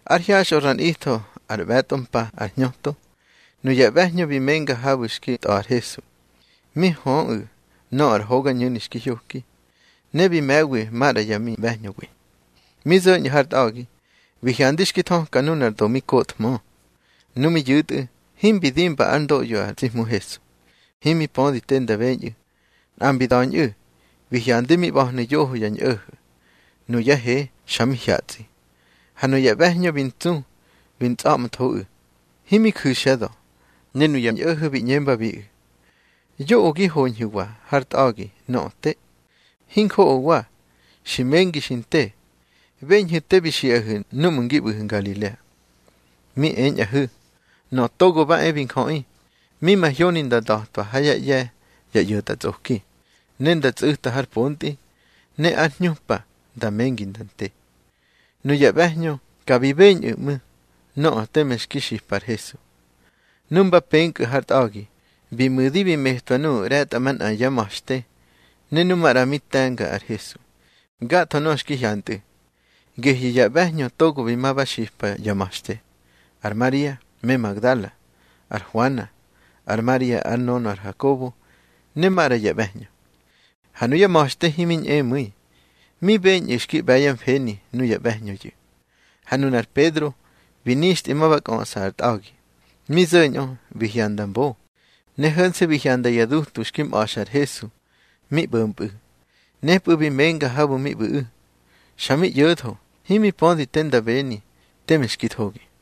Ár hyaxꞌö ra nꞌitho ár mꞌe̱tꞌo mpa ar hñöto, nuya ꞌbe̱hñö bi menga habu̱ xki tꞌa̱ ar Hesu, mi höꞌu̱ nöꞌö ar hogañu̱ni xki hyoki. Ne bi me̱wi maꞌra yá miꞌbe̱hñöwi. Mi zo̱ñꞌu̱ har tꞌa̱gi, bi hyandi xki thöka nunar do mi kothmö. Nu mi yu̱tꞌu̱, himbi dimba ár ndoꞌyo ar tsi Hmu Hesu. Himi pödi te nda beñꞌu̱. Nꞌa mbi da̱ñꞌu̱, bi hyandi mi ꞌba̱hnu̱ yoho ya ñꞌo̱ho̱, nuyá he xa mi hyatsꞌi. Ha nuya ꞌbe̱hñö bi ntsu bi ntsꞌa̱ꞌmthoꞌu̱, himi ju̱xyá da̱. Ne nuya ñꞌo̱ho̱ bi ꞌñembabiꞌu̱: —Yoꞌö gi hoñhu̱wa har tꞌa̱gi nöꞌö te. Hinjoꞌowa, xi mengi xi nte. Beñhu̱ te bi xiꞌahu̱ núꞌmu̱ ngi ꞌbu̱hu̱ Ngalilea. Mi eñꞌahu̱, Nöꞌö Togo ba e bi Njöꞌi, mi mahyoni nda nda̱twa ha yá ꞌye̱ ya ꞌyo̱tꞌatsꞌoki, ne nda tsꞌu̱ta har pontꞌi. Ne ár hñupa nda mengi nda nte. Nuya ꞌbe̱hñö ka bi beñꞌu̱ ꞌmu̱ nöꞌö teme xki xipa ar Hesu. Nu mba penkꞌu̱ har tꞌa̱gi, bi mu̱di bi metwa nuꞌu̱ ꞌre̱tꞌamanꞌa yá ma̱xte ne nu maꞌra mi te̱nga ar Hesu, gatho nöꞌö xki hyantꞌu̱. Gehyu̱ ya ꞌbe̱hñö togo bi ma ba xipa ya ma̱xte: Ar Maria me Magdala, ar Huana, ar Maria ár nönö ar Hakobo, ne maꞌra ya ꞌbe̱hñö. Ha nuya ma̱xte himi ñꞌemu̱i, mi beñꞌu̱ xki ꞌbe̱ yá mfeni nuya ꞌbe̱hñöyu̱. Ha nunar Pedro bi nixtꞌi ma ba kꞌöꞌsa ar tꞌa̱gi. Mi zo̱ñꞌö bi hyanda mbo, ne ho̱nse̱ bi hyanda ya dutu xki mꞌa̱xa ar Hesu mi ꞌbo̱mpꞌu̱. Nepꞌu̱ bi menga habu̱ mi ꞌbu̱ꞌu̱, xa mi ꞌyo̱tho, himi pödi te nda beni teme xki thogi.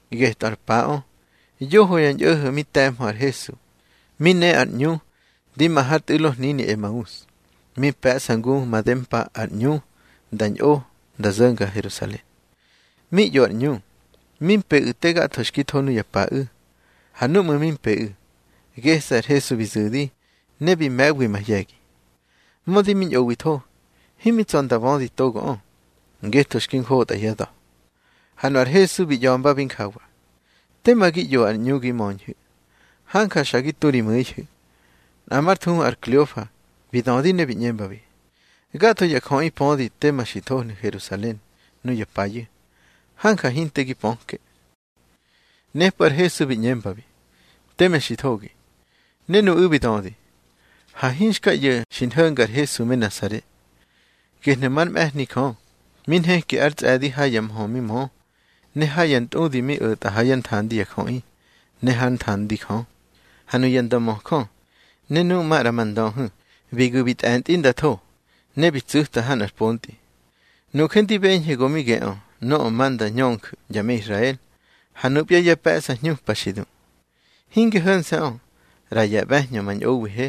Getꞌö ar paꞌö yoho ya ñꞌo̱ho̱ mi te̱mhö ar Hesu, mi ne ar ꞌñu ndi ma har tꞌu̱lo hnini Emaus, mi pe̱ꞌsa ngu madempa ar ꞌñu nda ñꞌo nda zo̱nga Herusalen. Mi ꞌyo ar ꞌñu, mi mpeꞌu̱ te gatho xki tho nuya paꞌu̱. Ha núꞌmu̱ mi mpeꞌu̱, gese̱ ar Hesu bi zu̱di, ne bi me̱wi mahye̱gi. Mödi mi ñꞌowitho, himi tsa̱ nda bödi togoꞌö, ngetho xki njotꞌa yá da̱. Ha nu ar Hesu bi ꞌya̱mbabi njawa: —Tema gi ꞌyo ar ꞌñu gi möñhu̱. Hanja xa gi tu ri mu̱ihu̱. Nꞌa mar thuhu ar Kleofa, bi dödi ne bi ꞌñembabi: —Gatho ya jöꞌi pödi tema xi thohnu̱ Herusalen nuya payu̱. Hanja hinte gi pöke. Nepꞌu̱ ar Hesu bi ꞌñembabi: —Teme xi thogi. Ne nuꞌu̱ bi dödi: —Ha hinxka ꞌyo̱ xi nho̱nga ar Hesu me Nasare, gehnu̱ már mꞌe̱hni Jö. Mi nheki ár tsꞌe̱di ha ya mhö mi mö, ne ha ya ntꞌudi mi o̱tꞌa ha yá nthandi ya jöꞌi ne hár nthandi Jö. Ha nuya ndömöjö, ne nuꞌu̱ maꞌra ma ndöhu̱, bi gu̱ bi tꞌe̱ntꞌi nda tho, ne bi tsꞌu̱ta ha nꞌar pontꞌi. Nuje ndi beñhe go mi geꞌö nöꞌö ma nda ñönju̱ ya me Israel. Ha nupya ya pe̱ꞌsa hñupa xi du. Hinge ho̱nse̱ꞌö, ꞌra ya ꞌbe̱hñö ma ñꞌowihe,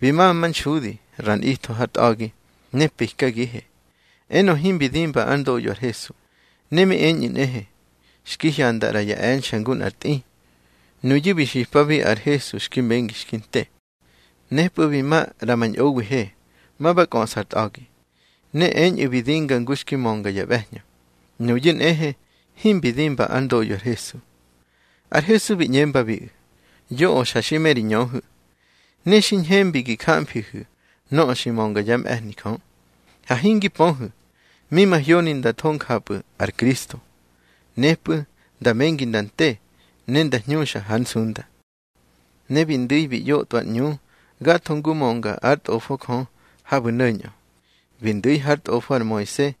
bi ma manxudi ra nꞌitho har tꞌa̱gi. Ne pikagihe, enö himbi dimba ár ndoꞌyo ar Hesu. Ne mi eñꞌu̱ nꞌehe, xki hyanda ꞌra ya e̱nxe̱ ngu nꞌar tꞌi. Nuyu̱ bi xipabi ar Hesu xki mengi xki nte. Nepꞌu̱ bi ma ꞌra ma ñꞌowihe, ma ba kꞌöꞌsa ar tꞌa̱gi. Ne eñꞌu̱ bi dinga ngu xki mönga ya ꞌbe̱hñö. Nuyu̱ nꞌehe himbi dimba ár ndoꞌyo ar Hesu. Ar Hesu bi ꞌñembabiꞌu̱: —Yoꞌö xa xi me ri ñöhu̱, ne xi ñhembi gi jamfihu̱ nöꞌö xi mönga yá mꞌe̱hni Jö. Ha hingi pöhu̱ mi mahyoni nda tho njapꞌu̱ ar Kristo, nepꞌu̱ nda mengi nda nte, ne nda hñuxa hár nsunda. Ne bi ndu̱i bi ꞌyotꞌwa ar ꞌñu gatho ngu mönga ár Tꞌofo Jö habu̱ no̱ñꞌö. Bi ndu̱ hár tꞌofo ar Moise,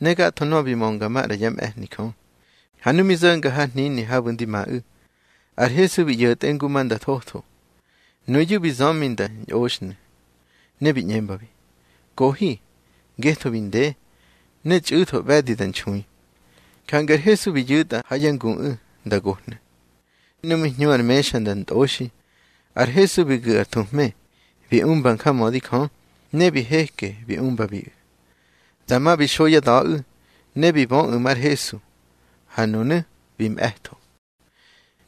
ne gatho nöꞌö bi mönga maꞌra yá mꞌe̱hni Jö. Ha nu mi zo̱nga har hnini habu̱ ndi maꞌu̱, ar Hesu bi ꞌyo̱tꞌe ngu ma nda thotho. Nuyu̱ bi zömi nda ñꞌoxhnu̱, ne bi ꞌñembabi: —Kohi, ngetho bi nde, ne txꞌu̱tho ꞌbe̱di da nxui. Jange ar Hesu bi yu̱tꞌa ha yá nguꞌu̱ nda gohnu̱. Nu mi hñu har mexa nda ntꞌoxi, ar Hesu bi gu̱ ar thuhme, bi umba njamödi Jö, ne bi heke bi umbabiꞌu̱. Dama bi xo yá da̱ꞌu̱, ne bi böꞌu̱ mar Hesu. Ha nunu̱ bi mꞌe̱tho.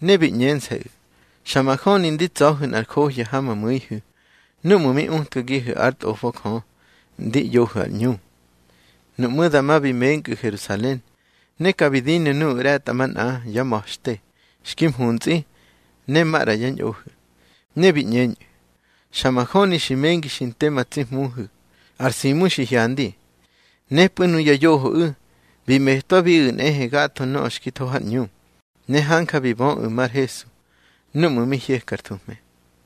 Ne bi ꞌñense̱ꞌu̱: —Xa majöni ndi tsa̱hu̱ nꞌar johya ha ma mu̱ihu̱ núꞌmu̱ mi utkagihu̱ ár Tꞌofo Jö ndi ꞌyohu̱ har ꞌñu. Nuꞌmú̱ dama bi menkꞌu̱ Herusalen. Ne ka bi dinu̱ nuꞌu̱ ꞌre̱tꞌamanꞌa yá ma̱xte xki mhuntsꞌi, ne maꞌra yá ñꞌohu̱. Ne bi ꞌñeñꞌu̱: —Xa majöni xi mengi xi nte ma tsi Hmuhu̱. Ar Simu xi hyandi. Nepꞌu̱ nuya yohoꞌu̱ bi metwabiꞌu̱ nꞌehe gatho nöꞌö xki tho har ꞌñu, ne hanja bi böꞌu̱ mar Hesu núꞌmu̱ mi hyeka ar thuhme.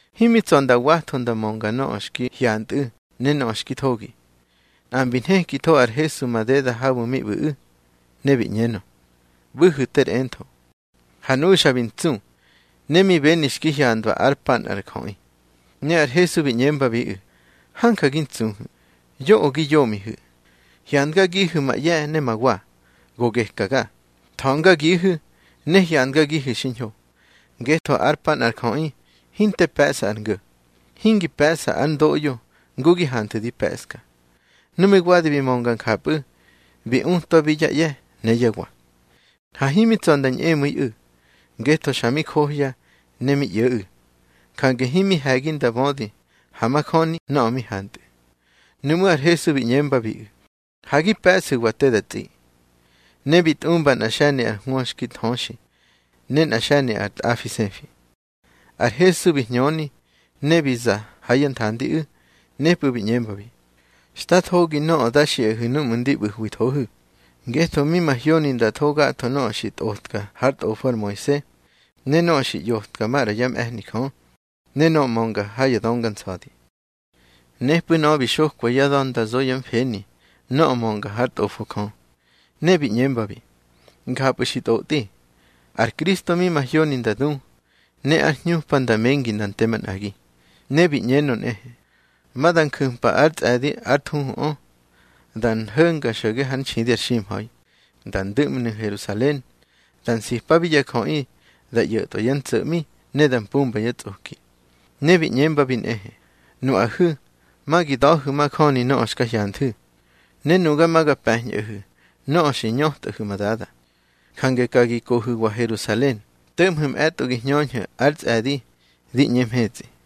Himi tsa̱ nda watho nda mönga nöꞌö xki hyantꞌu̱ ne nöꞌö xki thogi, nꞌa mbi nhekitho ar Hesu madeda habu̱ mi ꞌbu̱ꞌu̱, ne bi ꞌñenö: —ꞌBu̱hu̱ ter entho. Ha nuꞌu̱ xa bi ntsu, ne mi beni xki handwa ár pa nꞌar jöꞌi. Ne ar Hesu bi ꞌñembabiꞌu̱: —Hanja gi ntsuhu̱. Yoꞌö gi yomihu̱. Hyandgagihu̱ ma ꞌye̱ ne ma wa, go gekaga. Tha̱ngagihu̱ ne hyandgagihu̱ xiñho, ngetho ár pa nꞌar jöꞌi hinte pe̱ꞌsa ár ngo̱, hingi pe̱ꞌsa ár ndoꞌyo ngu gi hanthu̱ di pe̱ꞌska. Nu mi wadi bi mönga njapꞌu̱, bi utwabi yá ꞌye̱ ne yá wa. Ha himi tsa̱ nda ñꞌemu̱iꞌu̱, ngetho xa mi johya ne mi ꞌyo̱ꞌu̱. Jange himi he̱gi nda bödi ha majöni nöꞌö mi hantꞌu̱. Nuꞌmú̱ ar Hesu bi ꞌñembabiꞌu̱: —Ha gi pe̱ꞌsu̱wa te da tsꞌi. Ne bi tꞌumba nꞌar xe̱ni ar hwö xki nthöxi, ne nꞌa xe̱ni ar tꞌafi sefi. Ar Hesu bi hñöni, ne bi za ha yá nthandiꞌu̱. Nepꞌu̱ bi ꞌñembabi: —Xta thogi nöꞌö da xiꞌahu̱ núꞌmu̱ ndi ꞌbu̱hwithohu̱. Ngetho mi mahyoni nda tho gatho nöꞌö xi tꞌotka hár tꞌofo ar Moise, ne nöꞌö xi ꞌyotka maꞌra yá mꞌe̱hni Jö, ne nöꞌö mönga ha ya Dönga Nsa̱di. Nepꞌu̱ nöꞌö bi xokwa yá da̱ nda zo yá mfeni nöꞌö mönga hár Tꞌofo Jö. Ne bi ꞌñembabi: —Njapꞌu̱ xi ntꞌotꞌi, ar Kristo mi mahyoni nda du, ne ár hñupa nda mengi nda nte manꞌagi. Ne bi ꞌñenö nꞌehe, ma da nju̱mpa ár tsꞌe̱di ár thuhuꞌö, da nho̱nga xo̱ge ár nxidi ar ximha̱i, da ndu̱ꞌmnu̱ Herusalen. Da nsipabi ya jöꞌi da ꞌyo̱tꞌwa yá ntso̱ꞌmi ne da mpumba yá tsꞌoki. Ne bi ꞌñembabi nꞌehe: —Nuꞌahu̱ ma gi da̱hu̱ majöni nöꞌö xka hyanthu̱. Ne nuga ma ga pe̱ñꞌahu̱ nöꞌö xi ñötꞌahu̱ ma Dada. Jange ka gi kohu̱wa Herusalen, to̱ꞌmhu̱ mꞌe̱tꞌo gi hñöñhu̱ ar tsꞌe̱di di ꞌñe mhetsꞌi.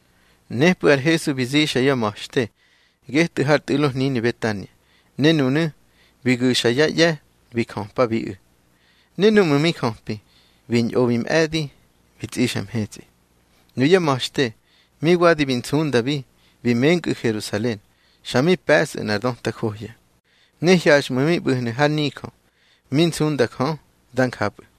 Nepꞌu̱ ar Hesu bi zixa yá ma̱xte getꞌu̱ har tꞌu̱lo hnini Betania. Ne nunu̱ bi gu̱xa yá ꞌye̱ bi jöpabiꞌu̱. Ne núꞌmu̱ mi jöpi, bi ñꞌo bi mꞌe̱di bi tsꞌixa mhetsꞌi. Nuyá ma̱xte mi wadi bi nsundabi bi menkꞌu̱ Herusalen, xa mi pe̱sꞌu̱ nꞌar döta johya. Ne hyaxꞌmu̱ mi ꞌbu̱hnu̱ har nijö, mi nsunda Jö. Dá njapꞌu̱.